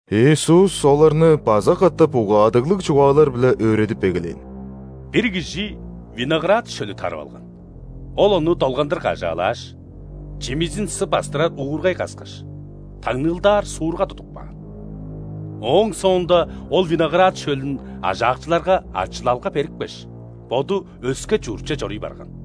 Иисус оларны база катап угаадыглыг чугаалар-биле өөредип эгелээн: «Бир кижи виноград шөлү тарып алган. Ол ону долгандыр кажаалааш, чимизин сы бастырар уургай каскаш, таңныылдаар суурга тудуп каан. Ооң соонда ол виноград шөлүн ажаакчыларга ачылалга берипкеш, боду өске чуртче чоруй барган.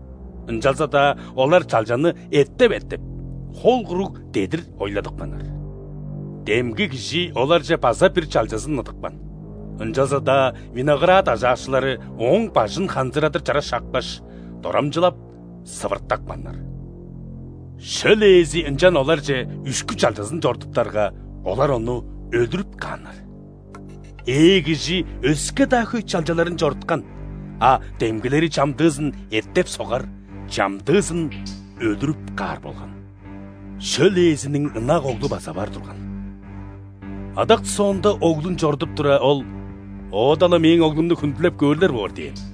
Ынчалза-даа олар чалчаны эттеп-эттеп, хол куруг дедир ойладыпканнар. Демги кижи оларже база бир чалчазын ыдыпкан, ынчалза-даа виноград ажаакчылары ооң бажын ханзырадыр чара шапкаш, дорамчылап, сывыртапканнар. Шөл ээзи ынчан оларже үшкү чалчазын чорудуптарга, олар ону өлүрүп кааннар. Ээ кижи өске-даа хөй чалчаларын чоруткан, а демгилери чамдыызын эттеп-согар, чамдыызын өлүрүп каар болган. Шөл ээзиниң ынак оглу база бар турган. Адак соонда оглун чорудуп тура, ол: „Оода-ла мээң оглумну хүндүлеп көөрлер боор“ – дээн.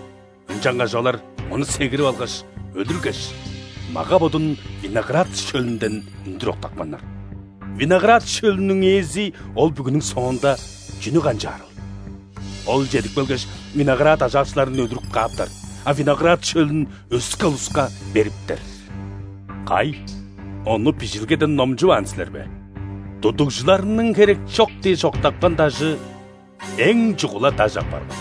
Ынчангаш олар ону сегирип алгаш, өлүргеш, мага-бодун виноград шөлүнден үндүр октапканнар. Виноград шөлүнүң ээзи ол бүгүнүң соонда чүнү канчаарыл? Ол чедип келгеш, виноград ажаакчыларын өлүрүп кааптар, а виноград шөлүн өске улуска бериптер. Кай, ону Бижилгеден номчуваан силер бе:„Тудугжуларның херекчок дээш октапкан дажыэң чугула даш апарган.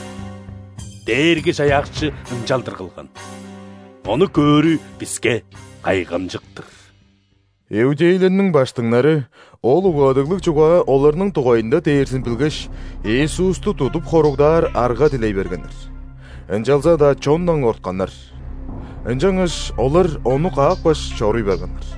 Дээрги-Чаяакчы ынчалдыр кылган,ону көөрү биске кайгамчык-тыр!“». Иудейлерниң ·баштыңнары ол угаадыглыг чугаа оларның дугайында дээрзин билгеш, Иисусту тудуп хоругдаар арга дилей бергеннер, ынчалза-даа чондан кортканнар. Ынчангаш олар Ону каапкаш, чоруй барганнар.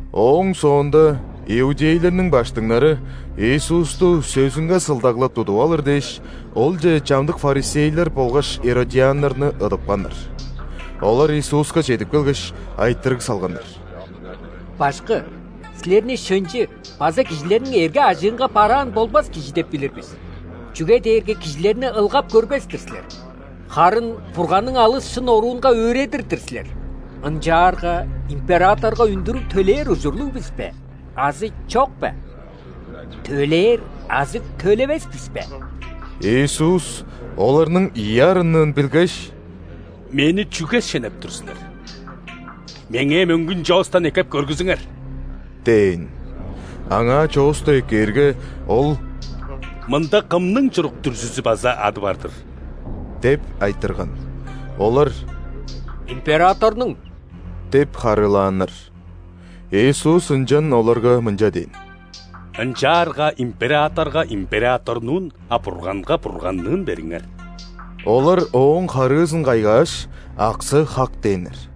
Ооң соонда иудейлерниң баштыңнары Иисусту сөзүнге сылдаглап тудуп алыр дээш, Олче чамдык ·фарисейлер болгаш иродианнарны ыдыпканнар. Олар Иисуска чедип келгеш, айтырыг салганнар: «Башкы! Силерни шынчы база кижилерниң эрге-ажыынга бараан болбас кижи деп билир бис. Чүге дээрге кижилерни ылгап көрбес-тир силер, харын Бурганның алыс шын оруунга өөредир-дир силер. Ынчаарга императорга үндүрүг төлээр ужурлуг бис бе азы чок бе? Төлээр азы төлевес бис бе?» Иисус оларның ийи арынныын билгеш: «Мени чүге шенеп тур силер? Меңээ мөңгүн чоостан эккеп көргүзүңер» – дээн. Аңаа чоосту эккээрге, Ол: «Мында кымның чурук-дүрзүзү база ады бар-дыр?» – деп айтырган. Олар: «Императорнуң» – деп харыылааннар. Иисус ынчан оларга мынча дээн: «Ынчаарга императорга – императорнуун, а Бурганга – Бурганныын бериңер». Олар Ооң харыызын кайгааш, аксы хак дээннер.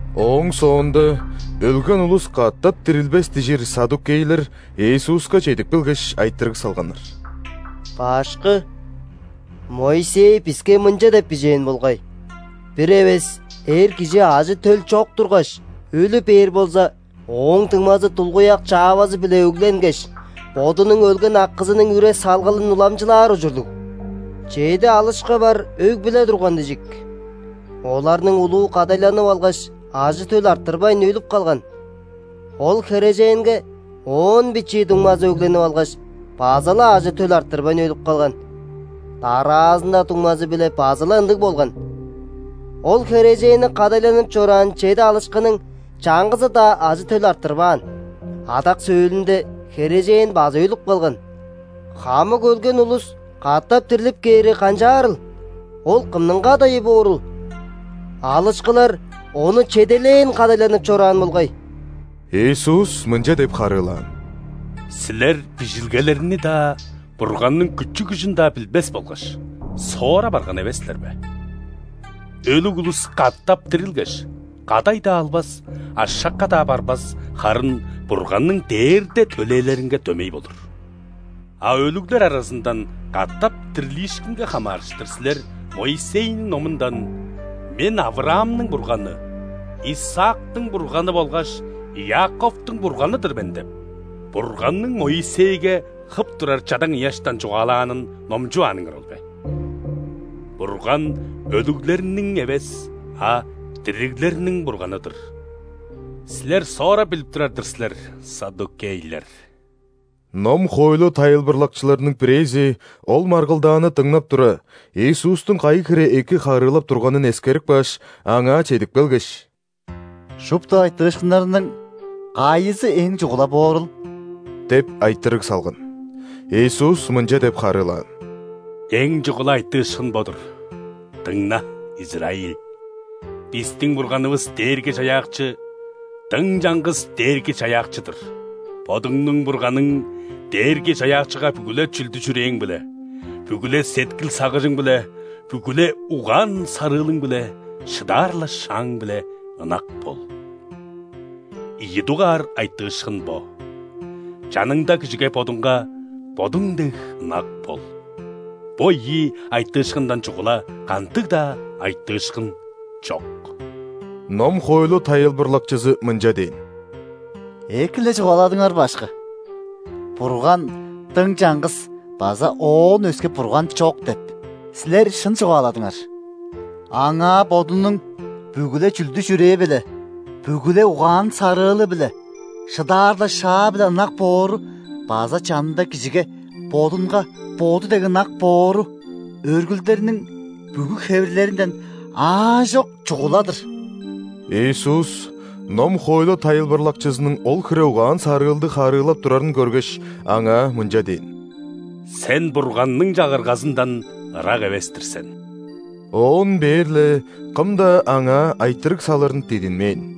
Ооң соонда: «Өлген улус катап дирилбес» – дижир ·саддукейлер Иисуска чедип келгеш, айтырыг салганнар: «Башкы! Моисей биске мынча деп бижээн болгай: „Бир эвес эр кижи ажы-төл чок тургаш, өлү бээр болза, ооң дуңмазы дулгуяк чаавазы-биле өгленгеш, бодунуң өлген акызының үре-салгалын уламчылаар ужурлуг“. Чеди алышкы бар өг-бүле турган дижик. Оларның улуу кадайланып алгаш, ажы-төл арттырбайн, өлүп калган. Ол херээженге оон бичии дуңмазы өгленип алгаш, база-ла ажы-төл арттырбайн, өлүп калган. Дараазында дуңмазы-биле база-ла ындыг болган. Ол херээженни кадайланып чораан чеди алышкының чаңгызы-даа ажы-төл арттырбаан. Адак сөөлүнде херээжен база өлүп калган. Хамык өлген улус катап дирлип кээрге, канчаарыл? Ол кымның кадайы боорул? Алышкылар ону чеделээн кадайланып чораан болгай». Иисус мынча деп харыылаан: «Силер Бижилгелерни-даа, Бурганның күчү-күжүн-даа билбес болгаш, соора барган эвес силер бе? Өлүг улус катап дирилгеш, кадай-даа албас, ашакка-даа барбас, харын Бурганның дээрде төлээлеринге дөмей болур. А өлүглер аразындан катап дирлиишкинге хамаарыштыр силер Моисейниң номундан: „Мен – Авраамның Бурганы, Исаактың Бурганы болгаш Иаковтуң Бурганы-дыр мен“ – деп, Бурганның Моисейге хып турар чадаң ыяштан чугаалаанын номчувааныңар ол бе? Бурган – өлүглерниң эвес, а дириглерниң Бурганы-дыр! Силер соора билип турар-дыр силер, ·саддукейлер!» Ном-хоойлу тайылбырлакчыларының бирээзи ол маргылдааны дыңнап тура, Иисустуң кайы хире эки харыылап турганын эскерип кааш, Аңаа чедип келгеш: «Шупту айтыышкыннарның кайызы эң чугула боорул?» – деп айтырыг салган. Иисус мынча деп харыылаан: «Эң чугула айтыышкын бо-дур: „Дыңна, Израиль! Бистиң Бурганывыс Дээрги-Чаяакчы – дың чаңгыс Дээрги-Чаяакчы-дыр. Бодуңнуң Бурганың Дээрги-Чаяакчыга бүгү-ле чүлдү-чүрээң-биле, бүгү-ле сеткил-сагыжың-биле, бүгү-ле угаан-сарыылың-биле, шыдаар-ла шааң-биле ынак бол“. Ийи дугаар айтыышкын бо: „Чаныңда кижиге бодуңга бодуң дег ынак бол“. Бо ийи айтыышкындан чугула кандыг-даа айтыышкын чок». Ном-хоойлу тайылбырлакчызы мынча дээн: «Эки-ле чугааладыңар, Башкы. „Бурган дың чаңгыс база Оон өске Бурган чок“ – деп, Силер шын чугааладыңар. Аңаа бодунуң бүгү-ле чүлдү-чүрээ-биле, бүгү-ле угаан-сарыылы-биле, шыдаар-ла шаа-биле ынак боору база чанында кижиге бодунга боду дег ынак боору – өргүлдерниң бүгү хевирлеринден аажок чугула-дыр». Иисус ном-хоойлу тайылбырлакчызының ол хире угаан-сарыылдыг харыылап турарын көргеш, аңаа мынча дээн: «Сен Бурганның Чагыргазындан ырак эвес-тир сен». Оон бээр-ле кым-даа Аңаа айтырыг салырын дидинмээн.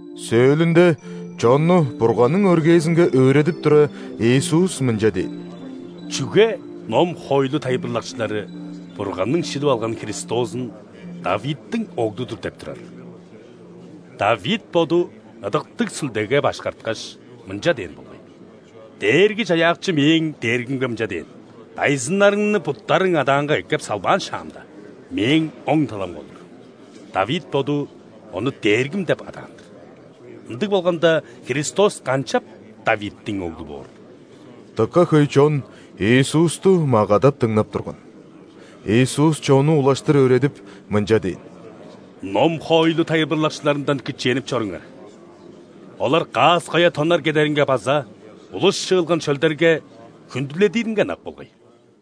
Сөөлүнде, чонну Бурганның өргээзинге өөредип тура, Иисус мынча дээн: «Чүге ном-хоойлу тайылбырлакчылары Бурганның шилип алган Христозун ·Давидтиң Оглу-дур деп турарыл? Давид боду, Ыдыктыг Сүлдеге башкарткаш, мынча дээн болгай:„Дээрги-Чаяакчы мээң Дээргимге мынча дээн:‘Дайзыннарыңны буттарың адаанга эккеп салбаан шаамда,Мээң оң таламга олур’“. Давид боду Ону Дээргим деп адаан-дыр. Ындыг болганда, Христос канчап Давидтиң оглу боорул?» Дыка хөй чон Иисусту магадап дыңнап турган. Иисус чонну улаштыр өөредип, мынча дээн: «Ном-хоойлу тайылбырлакчыларындан кичээнип чоруңар. Олар каас-коя тоннар кедеринге база улус чыылган шөлдерге хүндүледиринге ынак болгай.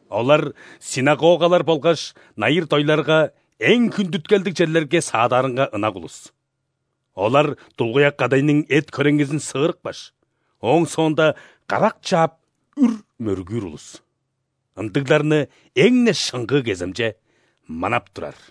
Олар ·синагогалар болгаш найыр-дойларга эң хүндүткелдиг черлерге саадаарынга ынак улус. Олар дулгуяк кадайның эт-хөреңгизин сыырыпкаш, ооң соонда карак чаап үр мөргүүр улус. Ындыгларны эң-не шыңгыы кеземче манап турар».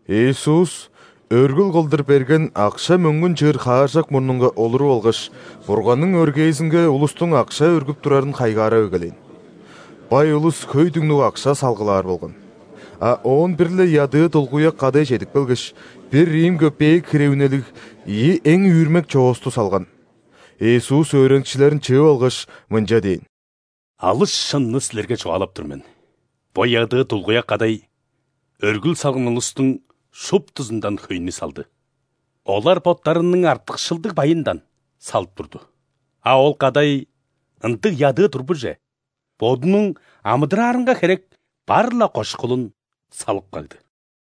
Иисус өргүл кылдыр берген акша-мөңгүн чыыр хааржак мурнунга олуруп алгаш, Бурганның өргээзинге улустуң акша өргүп турарын хайгаарап эгелээн. Бай улус хөй түңнүг акша салгылаар болган. А оон бир-ле ядыы дулгуяк кадай чедип келгеш, бир рим көпеек хире үнелиг ийи эң үүрмек чоосту салган. Иисус өөреникчилерин чыып алгаш, мынча дээн: «Алыс шынны силерге чугаалап тур мен: бо ядыы дулгуяк кадай өргүл салган улустуң шуптузундан хөйнү салды. Олар боттарының артыкшылдыг байындан салып турду, а ол кадай, ындыг ядыы турбуже, бодунуң амыдыраарынга херек бар-ла кошкулун салып кагды».